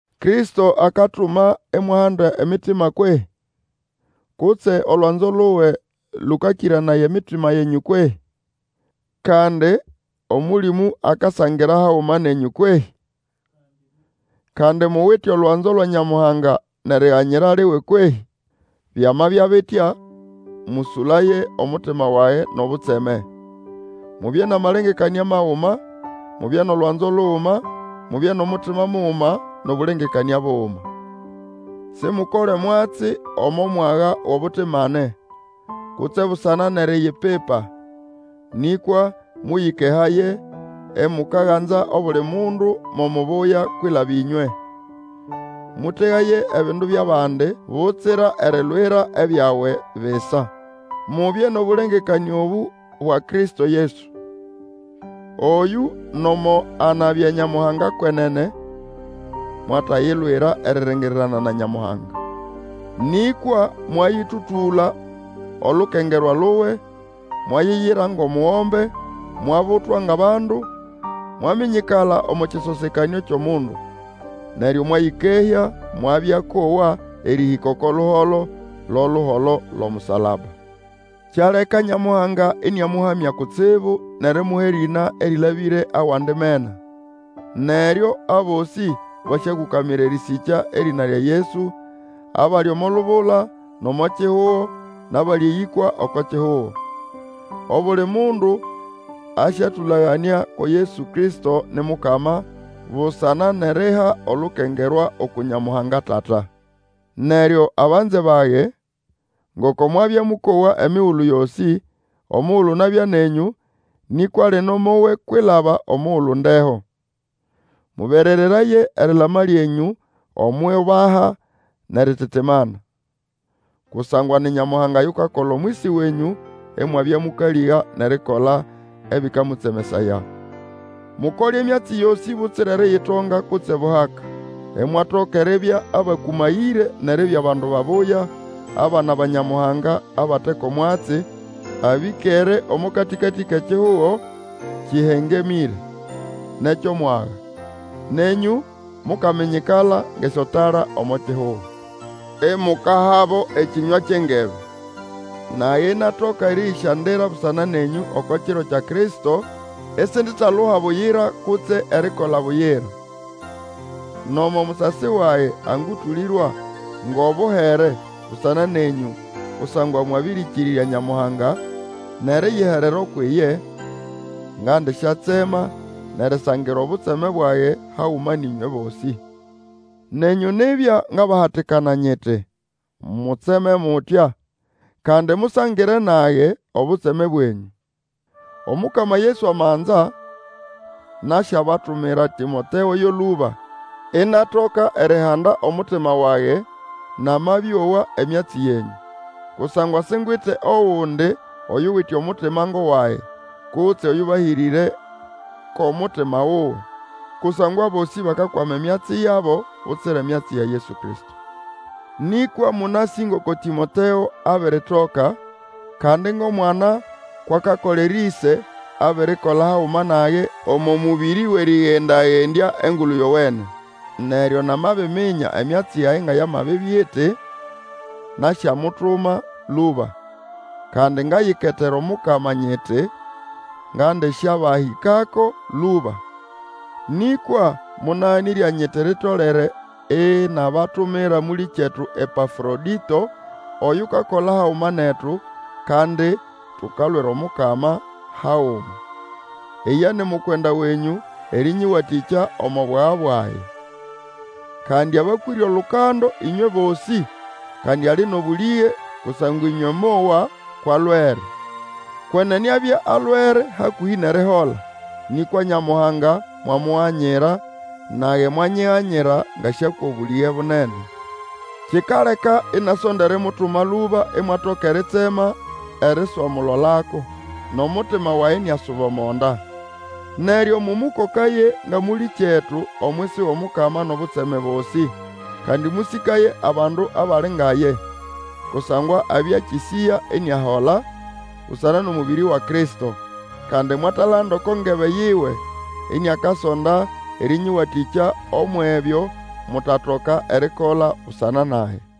Kristo akatuma imwahanda emitima kwehĩ? Kutse olwanzo luwe lũkakĩranaya emitima yenyũ kwehĩ? Kandi Omũlĩmũ akasangira haguma nenyũ kwehĩ? Kandi muwite olwanzo lwa Nyamuhanga nʼeriganyira liwe kwehĩ? Byamabya bitya, mũsũlaye, omutima wage nʼobutseme. Mubye nʼamalengekanĩa maguma, mubye nʼolwanzo luguma, mubye nʼomutima muguma, nʼobũlengekanĩa buguma. Simukole mwatsi omo mwaga wʼobutimane, kutse busana nʼeriyipipa, nĩkwa mũyĩkehaye, imukaganza obuli mundu mo mubuya kwilaba ĩnywe. Mũtegaye ebindu byʼabandi butsira erilwira ebyawe bisa. Mubye nʼobũlengekanĩa obũ bwa Kristo Yesu, oyũ, nomo anabya Nyamuhanga kwenene, mwatayilwira eriringirirana na Nyamuhanga. Nĩkwa mwayĩtũtũla olukengerwa luwe, mwayiyira ngʼomugombe, mwabutwa ngʼabandu, mwaminyikala omo kĩsosekanĩo kyʼomundu. Neryo mwayĩkehya, mwabya akowa, erĩhĩka oko luholo, lo luholo lwʼomusalaba. Kyaleka Nyamuhanga ĩnĩamũhamya kutsibu, nʼerimuha erĩna erĩlabĩre awandi mena. Neryo abosĩ basyakũkamira erĩsĩkya erĩna lya Yesu, abali omo lubula, nʼomo kihugo, nʼabali eyĩkwa oko kihugo. Obuli mundu asyatũlaganĩa ko Yesu Kristo ni Mukama, busana nʼeriha olukengerwa uku Nyamuhanga Tata. Neryo, abanze bage, ngoko mwabya mũkowa emigulu yosĩ omugulu nabya nenyũ, nĩkwa lino mowe kwilaba omugulu ndeho. Mũberereraye erilama lyenyũ omwʼiubaha nʼerititimana. Kusangwa ni Nyamuhanga yukakola omwisi wenyũ, imwabya mũkalĩga nʼerikola ebĩkamũtsemesaya. Mukole emyatsi yosĩ butsira eriyitonga kutse buhaka, Imwatoka eribya abakũmayĩre nʼeribya bandu babuya, abana ba Nyamuhanga abate ko mwatsi, abĩkere omo katĩkatĩ kʼekihugo kĩhengemĩre, nʼekyʼomwaga. Nenyũ mukaminyikala ngʼesyotala omo kihugo. Imukahabo ekĩnywa kyʼengebe. Nage inatoka erĩyĩsyandira busana nenyũ oko kiro kya Kristo, isinditaluha buyira kutse erikola buyira. Nomo musasi wage angũtũlĩrwa ngʼobuhere busana nenyũ kusangwa mwabĩrĩkĩrĩrya Nyamuhanga nʼeriyiherera ukwʼiye, ngandisyatsema nʼerisangira obutseme bwage haguma nʼĩnywe bosĩ. Nenyũ nibya, ngabahatikana nyiti, mutseme mutya, kandi musangire nage obutseme bwenyũ. Omukama Yesu amanza, nasyabatumira Tĩmoteo yo lũba, inatoka erihanda omutima wage namabĩowa emyatsi yenyũ. Kusangwa singwite ogundi oyuwite omutima ngʼowage, kutse oyũbahĩrĩre kʼomutima wuwe. Kusangwa abosĩ bakakwama emyatsi yabo butsira emyatsi ya Yesu Kristo. Nĩkwa mũnasĩ ngoko Tĩmoteo abiritoka, kandi ngʼomwana kwʼakakolera ĩse, abirikola haguma nage omo mũbĩrĩ wʼerĩgenda-gendya Engulu Yowene. Neryo namabiminya emyatsi yage nga yamabibya iti, nasyamutuma lũba. Kandi ngayiketera Omukama nyiti, ngandisyabahĩkako lũba. Nĩkwa monaganĩrya nyiti litolere inabatumira mũlĩkyetu Epafrodĩto, oyukakola haguma netu, kandi tukalwira Omukama haguma, lye ni mukwenda wenyũ erĩnyĩwatĩkya omo bwaga bwage. Kandi abakwĩre olukando ĩnywe bosĩ, kandi ali nʼobũlĩge, kusangwa ĩnywe mowa kwʼalwere. Kwenene abya alwere hakũhĩ nʼerihola, nĩkwa Nyamuhanga mwamuganyira, nage mwanyiganyira ngasyakwa obũlĩge bunene. Kikaleka inasonda erimutuma lũba imwatoka eritsema eriswamulolako, nʼomutima wage iniasuba omo nda. Neryo mũmũkokaye nga mũlĩkyetu omwisi wʼOmukama nʼobutseme bosĩ, kandi mũsĩkaye abandu abali nga ye. Kusangwa abya akĩsĩya iniahola busana nʼomũbĩrĩ wa Kristo. Kandi mwatalanda oko ngebe yiwe, iniakasonda erĩnyĩwatĩkya umwʼebyo mutatoka erikola busana nage.